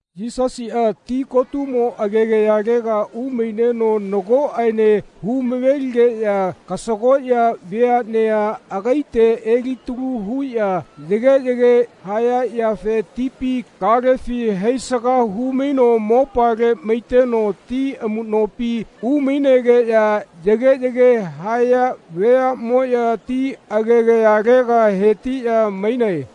Yisasiꞌa tikotumo agegayalega umaineno nagoꞌene humaveligeꞌya kasagoꞌya veaꞌnea agaite elitalu huꞌya yageꞌyage haya yafe tipi kalefi haisaga humaino mopale maiteno ti amuꞌnopi umainegeꞌya yageꞌyage haya veaꞌmoꞌya ti agegayalega hetiꞌya mainae.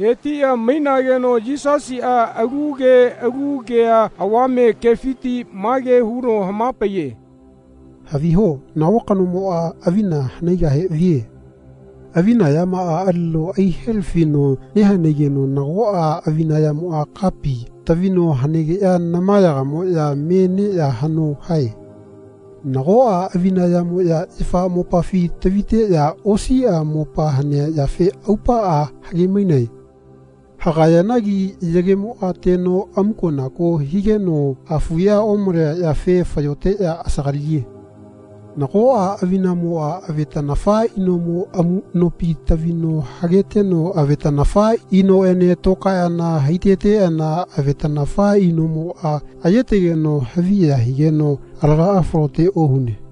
Hetiꞌya mainageno Yisasiꞌa alu ke alu kea avame kefiti mage huno hamapaiye “Haviho nago kanomoꞌa avina hanaigahe vie. Avina yamaꞌa alino aihelafino nehanaigeno nagoꞌa avinamoꞌa kapi tavino hanegeꞌya namayagamoꞌya me neꞌya haꞌno hae. Nagoꞌa avinamoꞌya yafa mopafi taviteꞌya osiꞌa mopa hanea yafe aupaꞌa hagemainae. Hagayanagi yagemoꞌa teno amukonako higeno hafuꞌya omalea yafe fayoteꞌya asagaliye. Nagoꞌa avinamoꞌa avetanafa inomo amuꞌnopi tavino hageteno avetanafa inoꞌene tokaeꞌana haiteteꞌana avetanafa inomoꞌa ayetegeno haviya higeno alagaꞌa falote ohune.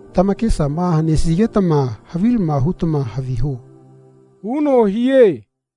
Tamakesama hanesigetama havilama hutama haviho.” huno hie.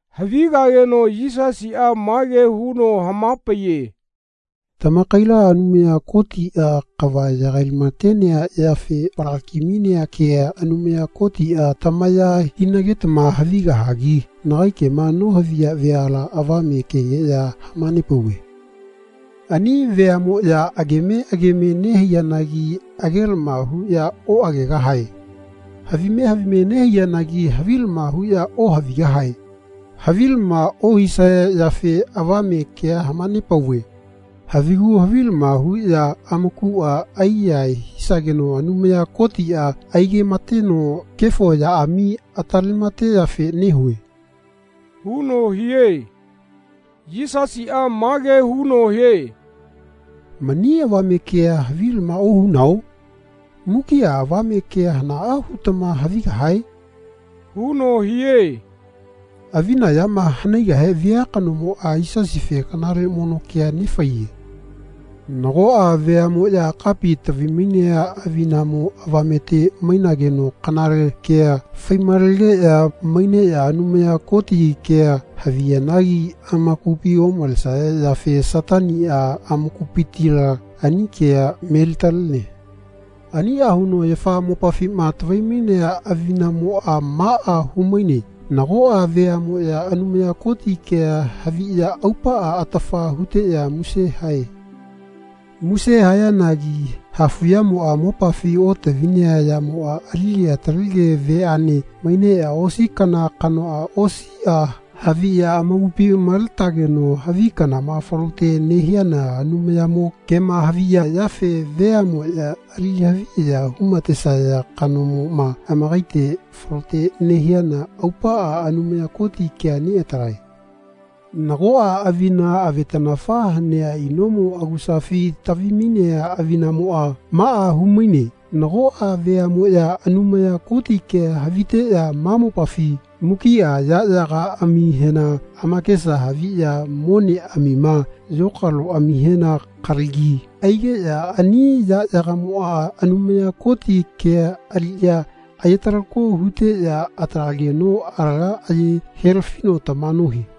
Havigageno Yisasiꞌa mage huno hamapaiye “Tamakaila Anumaya Kotiꞌa kava yagailamatenea yafe falakimainea kea Anumaya Kotiꞌa tamaya hinagetama havigahagi nagai kema nohaviya veala avame kekeꞌya hamanepauve. Ani veaꞌmoꞌya ageme geme nehaiyanagi agelama huꞌya oꞌagegahae. Havime havime nehaiyanagi havilama huꞌya ohavigahae. Havilama ohisaya yafe avame kea hamanepauve. Havigu havilama huꞌya amakuꞌa aiyahae hisageno Anumaya Kotiꞌa aigeꞌamateno kefo yaꞌami atalemateyafe nehue.” huno hie. Yisasiꞌa mage huno hie “Mani avame kea havilama ohunao? Mukiꞌa avame kea hanaꞌa hutama havigahae?” huno hie. Avina yama hanaigahe via kanomoꞌa Yisasife kanale mono kea nefaiye. Nagoꞌa veaꞌmoꞌya kapi tavimainea avinamo avamete mainageno kanale kea faimalegeya maineꞌya Anumaya Koti kea haviyanagi amakupi omalesaya yafe Sataniꞌa amakupitila ani kea melitalene. Aniꞌa huno yafa mopafima tavimainea avinamoꞌa maꞌa humaine nagoꞌa veaꞌmoꞌya Anumaya Koti kea haviꞌya aupaꞌa atafa huteꞌya muse hae. Muse hayanagi hafuꞌyamoꞌa mopafi otavinea yamoꞌa alige atalege veaꞌne maineꞌya osi kana kanoꞌa osiꞌa haviꞌya amakupi maletageno havi kanama falote nehiano Anumayamo kema haviya yafe veaꞌmoꞌya ali haviya humatesaya kanamoꞌma amakaite falote nehiano aupaꞌa Anumaya Koti kea neꞌatalae. Nagoꞌa avina avetanafa hanea inomo agusafi tavimainea avinamoꞌa maꞌa humaine nagoꞌa veaꞌmoꞌya Anumaya Koti kea haviteꞌya ma mopafi mukiꞌa yaꞌyagaꞌamihena amakesa haviꞌya moneꞌamima yokaloꞌamihena kalagi aigeꞌya ani yaꞌyagamoꞌa Anumaya Koti kea aliꞌya ayetalako huteꞌya atalageno alaga aye helafino tama nohie.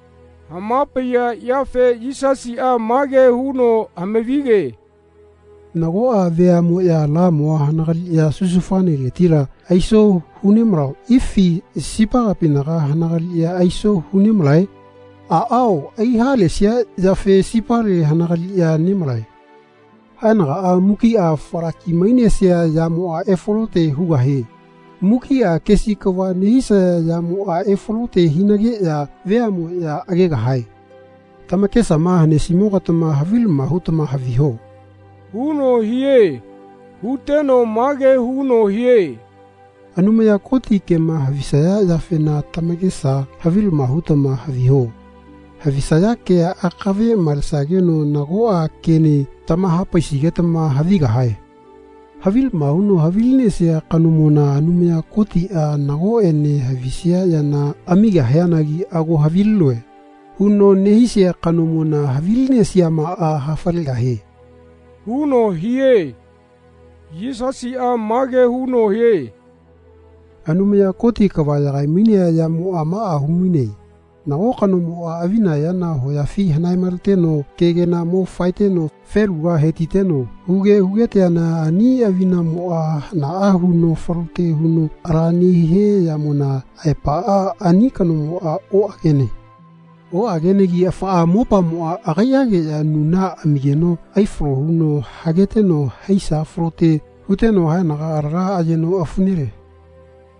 Hamapaiya yafe Yisasiꞌa mage huno hamavige “Nagoꞌa veaꞌmoꞌya lamua hanagaliꞌya susufaneletila aiso hunemalao ifi sipa kapinaga hanagaliꞌya aiso hunemalae? Aꞌao aihalesia yafe sipale hanagaliꞌya nemalae. Haenagaꞌa mukiꞌa falakimainesia yamoꞌa efalote hugahie. Mukiꞌa kesi kava nehisaya yamoꞌa efalote hinageꞌya veaꞌmoꞌya agegahae. Tamakesama hanesimogatama havilama hutama haviho.” huno hie. Huteno mage huno hie “Anumaya Koti kema havisaya yafena tamakesa havilama hutama haviho. Havisaya kea akave malesageno nagoꞌa kene tamahapaisigetama havigahae. Havilama huno havilinesia kanomona Anumaya Kotiꞌa nagoꞌene havisia yana amigahianagi ‘Ago havilinoe.’ huno nehisia kanomona havilinesiamaꞌa hafalegahie.” huno hie. Yisasiꞌa mage huno hie “Anumaya Koti kava yagaimainea yamoꞌa maꞌa humaine. Nago kanomoꞌa avina yana hoyafi hanaemaleteno kegela mo faeteno feluga hetiteno huge hugeteana ani avinamoꞌa hanaꞌa huno falote huno ala nehia yamona aepaꞌa ani kanomoꞌa oꞌagene. Oꞌagenegi afaꞌa mopamoꞌa agaiꞌageꞌya nuna amigeno aifalo huno hageteno haisa falote huteno haenaga alaga ayeno afu nele.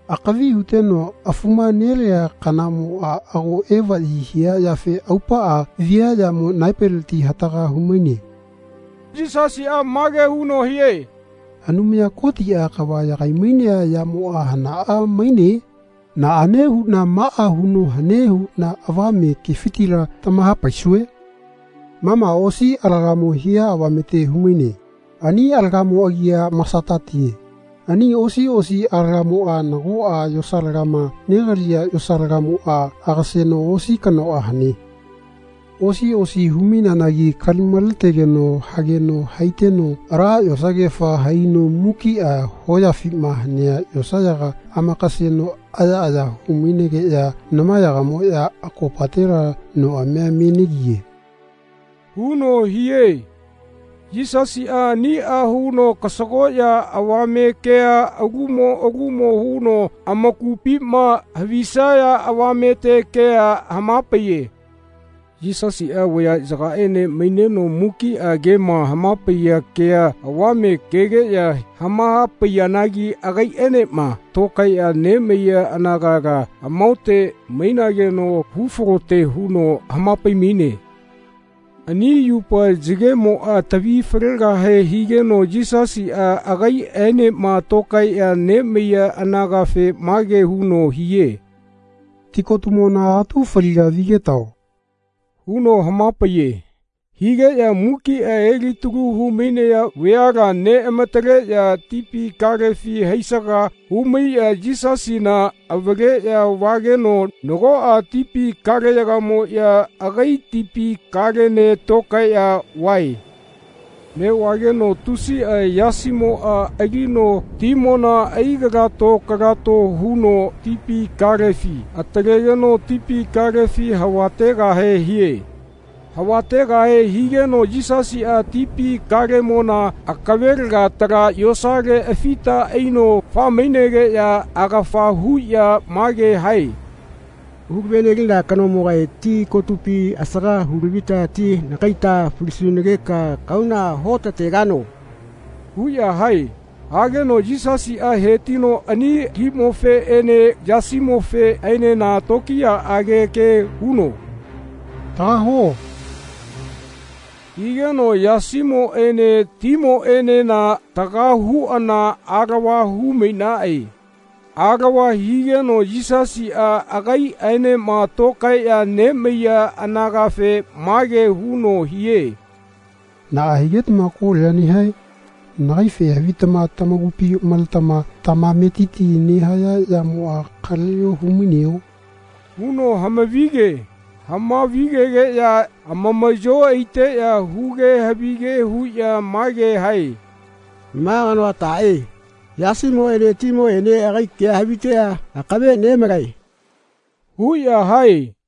Akavi huteno afuma nelea kanamoꞌa ago evaꞌyi hia yafe aupaꞌa viaꞌyamo naepeleti hataga humaine. Yisasiꞌa mage huno hie “Anumaya Kotiꞌa kava yagaimainea yamoꞌa hanaꞌa maine? Naꞌane huꞌna maꞌa huno hane huꞌna avame kefitila tamahapaisue? Ma ma osi alagamo hia avamete humaine. Ani alagamo agia masatatie. Ani osi osi alagamoꞌa nagoꞌa yosalagama negaliya yosalagamoꞌa agaseno osi kanoꞌa hane. Osi osi humaineanagi kalimaletegeno hageno haiteno ala yosagefa haino mukiꞌa hoyafima hanea yosayaga amakaseno ayaꞌaya humainegeꞌya namayagamoꞌya akopatela noꞌamia me negiye.” huno hie. Yisasiꞌa aniꞌa huno kasagoꞌya avame kea alumo alumo huno amakupima havisaya avamete kea hamapaiye. Yisasiꞌa vayaꞌyagaene maineno mukiꞌa kema hamapaiya kea avame kegeꞌya hamahapaiyanagi agaiꞌaenema tokaeꞌya nemaiya anagala amahaote mainageno hufalote huno hamapaimaine. Ani yupa yagemoꞌa tavifalegahe higeno Yisasiꞌa agaiꞌaenema tokaeꞌya nemaiya anagafe mage huno hie “Tikotumona atu faliga vigetao.” huno hamapaiye. Higeꞌya mukiꞌa elitalu humainaya veala neꞌamataleꞌya tipi kalefi haisaga humaiꞌya Yisasina avaleꞌya vageno nagoꞌa tipi kaleyagamoꞌya agai tipi kalene tokaeꞌya vae. Neꞌvageno tusiꞌa yasimoꞌa alino timona aikalato kalato huno tipi kalefi atalegeno tipi kalefi havategahe hie. Havategahe higeno Yisasiꞌa tipi kalemona akavelega tala yosale afita aino faemainegeꞌya agafa huꞌya mage hae “Hulavenelina kanomogae tikotupi asaga hulavita ti nakaita falisunageka kahauna huotategano?” huꞌya hae. Hageno Yisasiꞌa hetino ani limofeꞌene yasimofeꞌenena tokiyaꞌage ke huno “Taga huo.” higeno yasimoꞌene timoꞌenena taga huꞌana alava humainaꞌe. Alava higeno Yisasiꞌa agaiꞌaenema tokaeꞌya nemaiya anagafe mage huno hie “Naꞌa higetama kolia nehae? Nagaife havitama tamakupi maletama tamametiti nehaya yamoꞌa kaleꞌyo humaineo?” huno hamavige. Hamavigegeꞌya amamaꞌyo aiteꞌya huge havige huꞌya mage hae “Ma kanoa taꞌe? Yasimoꞌene timoꞌene agai kea haviteꞌya akave nemalae.” huꞌya hae.